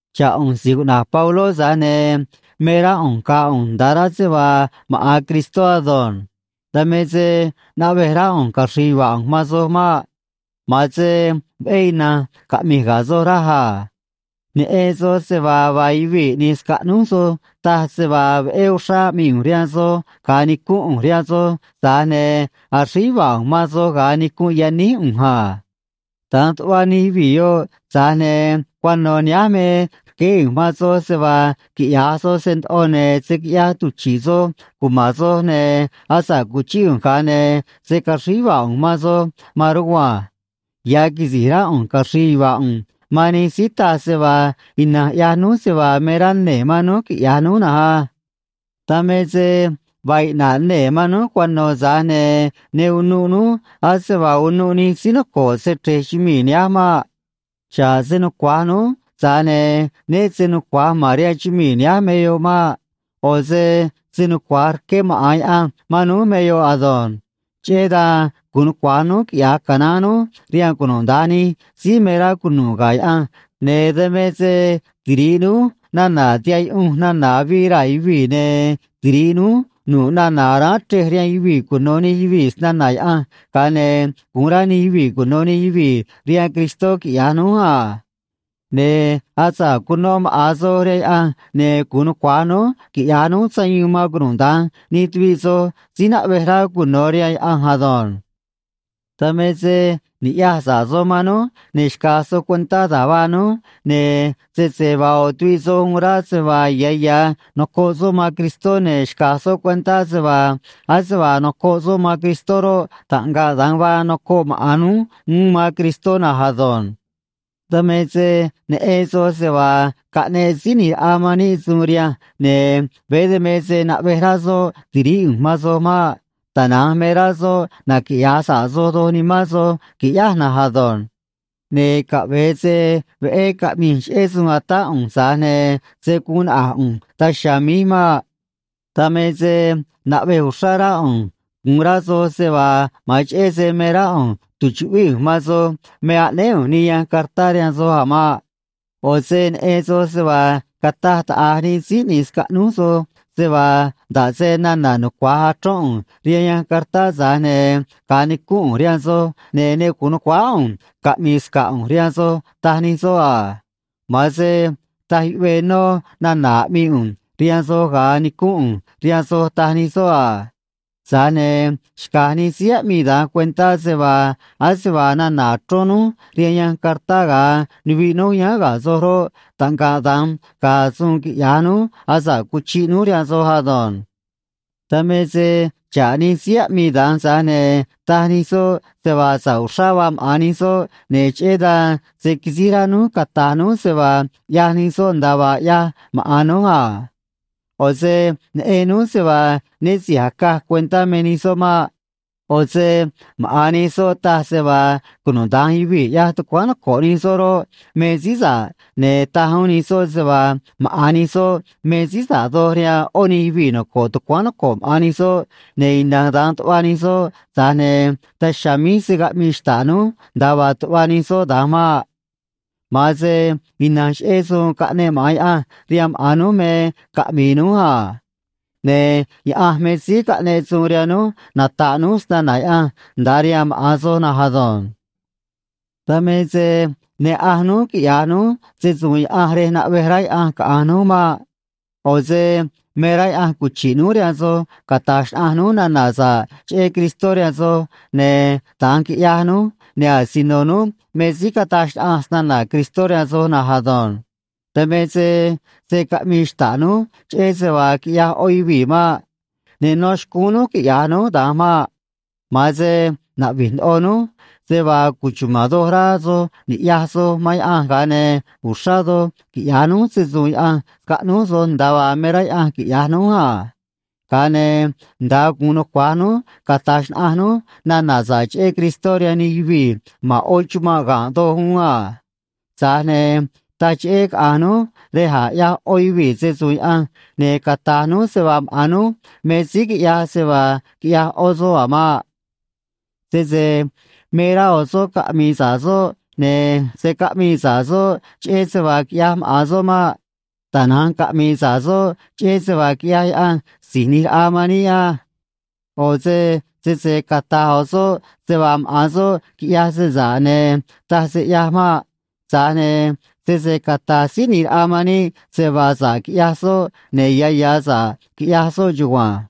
Xa̱ꞌ ꞌu̱nj si̱j cuꞌna̱j Pabló, tza̱j ne̱ me rá ꞌu̱nj ga̱a̱ ꞌu̱nj nda̱a rá se vaa maꞌa̱n Cristó ado̱nj. Dan me se naꞌvej rá ꞌu̱nj caxri̱i̱ yuva̱a̱ ꞌu̱nj man soj maꞌ. Ma̱an se veꞌé ina̱nj caꞌmi̱j ga̱ soj, raj a. Neꞌen soj se vaa vaa yuvii̱ ꞌni̱j scaꞌnúj soj taj se vaa veꞌé uxrá aꞌmii ꞌu̱nj rihaan soj ga̱a nicúnꞌ ꞌu̱nj rihaan soj, tza̱j ne̱ axríj yuva̱a̱ ꞌu̱nj man soj ga̱a nicunꞌ yaníj ꞌu̱nj a. Da̱nj tuꞌva nij yuvii̱ yoꞌ, tza̱j ne̱ cuano̱ nihánj me rqueé ꞌu̱nj man soj se vaa quiꞌya̱j soj se ndoꞌo, ne̱ se̱ quiꞌyaj tuchi̱ꞌ soj cuma̱n soj, ne̱ asa̱ꞌ cuchíꞌ ꞌu̱nj, ga̱a ne̱ se̱ caxríj yuva̱a̱ ꞌu̱nj man soj maan rugua̱nj. Ya̱ quisi̱j rá ꞌu̱nj caxri̱i̱ yuva̱a̱ ꞌu̱nj man nij síí taj se vaa ina̱nj ꞌyaj núj se vaa me rá nee̱ man núj quiꞌya̱j núj na̱nj á. Dan me se vaa iꞌna̱ꞌ nee̱ man núj cuano̱, tza̱j ne̱ ne unuꞌ núj ase vaa unuꞌ nij síí noco̱ꞌ se‑chre̱j chumii̱ nihánj maꞌ. Xa̱ꞌ se nucua̱j núj, tza̱j ne̱ né se nucua̱j ma̱n rihaan chumii̱ nihánj me yoꞌ maꞌ. ꞌO̱ se se nucua̱j rqué maꞌa̱n ya̱ Yaꞌanj man núj me yoꞌ ado̱nj. Cheꞌé dan gu̱un nucua̱j núj quiꞌya̱j canaán núj rihaan cunuda̱nj nij síí me rá cunu̱ꞌ ga̱ Yaꞌanj, ne̱ dan me se tiri̱ꞌ núj nana̱ tihaꞌ yuꞌunj nana̱ avii raa̱ yuvii̱, ne̱ tiri̱ꞌ núj nu̱ꞌ nana̱ aráán chrej rihaan yuvii̱ cuno̱ nij yuvii̱ snana̱ Yaꞌanj, ga̱a ne̱ gu̱un rá nij yuvii̱ cuno̱ nij yuvii̱ rihaan Cristó, quiꞌya̱j núj a. Ne̱ asa̱ꞌ cuno maꞌa̱n soj rihaan Yaꞌanj, ne̱ gu̱un nucua̱j núj quiꞌya̱j núj sayuun man cunuda̱nj nij tuviꞌ soj síí naꞌvej rá cuno̱ rihaan Yaꞌanj ado̱nj. Dan me se ni̱ꞌyaj sa̱ꞌ soj man núj, ne̱ xca̱j soj cuentá da̱j vaa núj, ne̱ sese vaa ꞌo̱ tuviꞌ soj uun rá se vaa ya̱ ya̱ nocoꞌ soꞌ man Cristó, ne̱ xca̱j soꞌ cuentá se vaa ase vaa noco̱ꞌ soꞌ man Cristó roꞌ, taꞌngaꞌ da̱nj vaa noco̱ꞌ maꞌa̱n núj uún man Cristó na̱nj ado̱nj. Dan me se neꞌen soj se vaa caꞌneꞌ Síí ꞌNi̱j Raꞌa man níꞌ suun rihanj, ne̱ veé dan me se naꞌvej rá soꞌ ti̱ríꞌ ꞌu̱nj man soj maꞌ. Tana̱nj me rá soꞌ naquiꞌya̱j sa̱ꞌ soj doj nimán soj qui̱ꞌyáj na̱nj ado̱nj. Ne̱ caꞌve̱e se veꞌé caꞌmi̱j cheꞌé suun a̱tá ꞌu̱nj, tza̱j ne̱ se̱ guun naꞌa̱j ꞌu̱nj daj chiha̱a̱ míj maꞌ. Dan me se naꞌvej uxrá rá ꞌu̱nj gu̱un rá soj se vaa ma̱an cheꞌé se me rá ꞌu̱nj tu̱chuꞌvíꞌ ꞌu̱nj man soj me aꞌnéé ꞌu̱nj nij yanj cartá rihaan soj a̱ maꞌ. ꞌO̱ se neꞌen soj se vaa cataj taꞌa̱j nij síí ꞌni̱j scaꞌnúj soj se vaa nda̱ꞌ se nana̱ nucua̱j achrón ꞌu̱nj rihaan yanj cartá, tza̱j ne̱ ga̱a nicúnꞌ ꞌu̱nj rihaan soj, ne̱ ne gu̱un nu̱cuáá ꞌu̱nj caꞌmi̱i̱ sca̱ꞌ ꞌu̱nj rihaan soj, taj nij soꞌ a. Ma̱an se taj yuꞌvee nó nana̱ aꞌmii ꞌu̱nj rihaan soj ga̱a nicúnꞌ ꞌu̱nj rihaan soj, taj nij soꞌ a. Tza̱j ne̱ xca̱j nij síí aꞌmii da̱nj cuentá se vaa ase vaa nana̱ achrón núj rihaan yanj cartá ga̱a nuviꞌ núj yáán ga̱ soj roꞌ, taꞌngaꞌ da̱nj ga̱a̱ suun quiꞌya̱j núj asa̱ꞌ cuchiꞌ núj rihaan soj ado̱nj. Dan me se xa̱ꞌ nij síí aꞌmii da̱nj, tza̱j ne̱ taj nij soꞌ se vaa sa̱ꞌ uxrá vaa maꞌa̱n nij soꞌ, ne̱ cheꞌé dan se̱ quisíj rá núj cata̱j núj se vaa ꞌyaj nij soꞌ nda̱a vaa ꞌyaj maꞌa̱n núj a. ꞌO̱ se neꞌen núj se vaa né si̱j acaj cuentá me nij soꞌ maꞌ. ꞌO̱ se maꞌa̱n nij soꞌ taj se vaa cunuda̱nj yuvii̱ ꞌyaj tucuáán noco̱ꞌ nij soꞌ roꞌ, me síí sa̱ꞌ, ne̱ taj uún nij soꞌ se vaa maꞌa̱n nij soꞌ me síí sa̱ꞌ doj rihaan ꞌó nij yuvii̱ noco̱ꞌ tucuáán noco̱ꞌ maꞌa̱n nij soꞌ, ne̱ ina̱nj da̱nj tuꞌva nij soꞌ, tza̱j ne̱ daj chiha̱a̱ míj se̱ caꞌmii xta̱ꞌ núj nda̱a vaa tuꞌva nij soꞌ da̱nj maꞌ. Ma̱an se ina̱nj cheꞌé suun caꞌneꞌ maꞌa̱n Yaꞌanj rihaan maꞌa̱n núj me caꞌmi̱i̱ núj a. Ne̱ Yaꞌanj me síí caꞌneꞌ suun rihaan núj nata̱ꞌ núj snana̱ Yaꞌanj nda̱a rihaan maꞌa̱n soj na̱nj ado̱nj. Dan me se ne ꞌanj núj quiꞌya̱j núj se‑su̱u̱n Yaꞌanj rej naꞌvej rá Yaꞌanj caꞌa̱nj núj maꞌ. ꞌO̱ se me rá Yaꞌanj cuchi̱ꞌ núj rihaan soj cata̱j xnaꞌanj núj nana̱ sa̱ꞌ cheꞌé Cristó rihaan soj, ne̱ da̱nj quiꞌyaj núj, ne̱ asino núj me síí cataj xnaꞌanj snana̱ Cristó rihaan soj na̱nj ado̱nj. Dan me se se̱ caꞌmii xta̱ꞌ núj cheꞌé se vaa quiꞌyaj ꞌó yuvii̱ maꞌ. Ne nó xcúún núj quiꞌya̱j núj da̱nj maꞌ. Ma̱an se naꞌvi̱j ndoꞌo núj se vaa cuchuma̱n doj rá soj ni̱ꞌyaj soj man Yaꞌanj, ga̱a ne̱ uxrá doj quiꞌya̱j núj se‑su̱u̱n Yaꞌanj scaꞌnúj soj, nda̱a vaa me rá Yaꞌanj quiꞌya̱j núj a. Ga̱a ne̱ nda̱a gu̱un nucua̱j núj cata̱j xnaꞌanj núj nana̱ sa̱ꞌ cheꞌé Cristó rihaan nij yuvii̱ ma̱n ꞌó chumanꞌ ga̱nꞌ doj uún a. Tza̱j ne̱ taj cheꞌé caꞌa̱nj núj rej a̱j ꞌyaj ꞌó yuvii̱ se‑su̱u̱n Yaꞌanj ne̱ cata̱j núj se vaa maꞌa̱n núj me síí quiꞌyaj se vaa quiꞌyaj ꞌó soꞌ a̱ maꞌ. Sese me rá ꞌo̱ soꞌ caꞌmi̱i̱ sa̱ꞌ soꞌ, ne̱ se̱ caꞌmii sa̱ꞌ soꞌ cheꞌé se vaa quiꞌyaj maꞌa̱n soꞌ maꞌ. Tana̱nj caꞌmi̱i̱ sa̱ꞌ soꞌ cheꞌé se vaa quiꞌyaj Yaꞌanj Si̱j ꞌNi̱j Raꞌa man níꞌ á. ꞌO̱ se sese cata̱j ꞌo̱ soꞌ se vaa maꞌa̱n soꞌ quiꞌyaj se sa̱ꞌ, ne̱ taj se ꞌyaj maꞌ. Tza̱j ne̱ sese cata̱j Síí ꞌNi̱j Raꞌa man níꞌ se vaa sa̱ꞌ quiꞌyaj soꞌ, ne̱ ya̱ ya̱ sa̱ꞌ quiꞌyaj soꞌ chugua̱nj.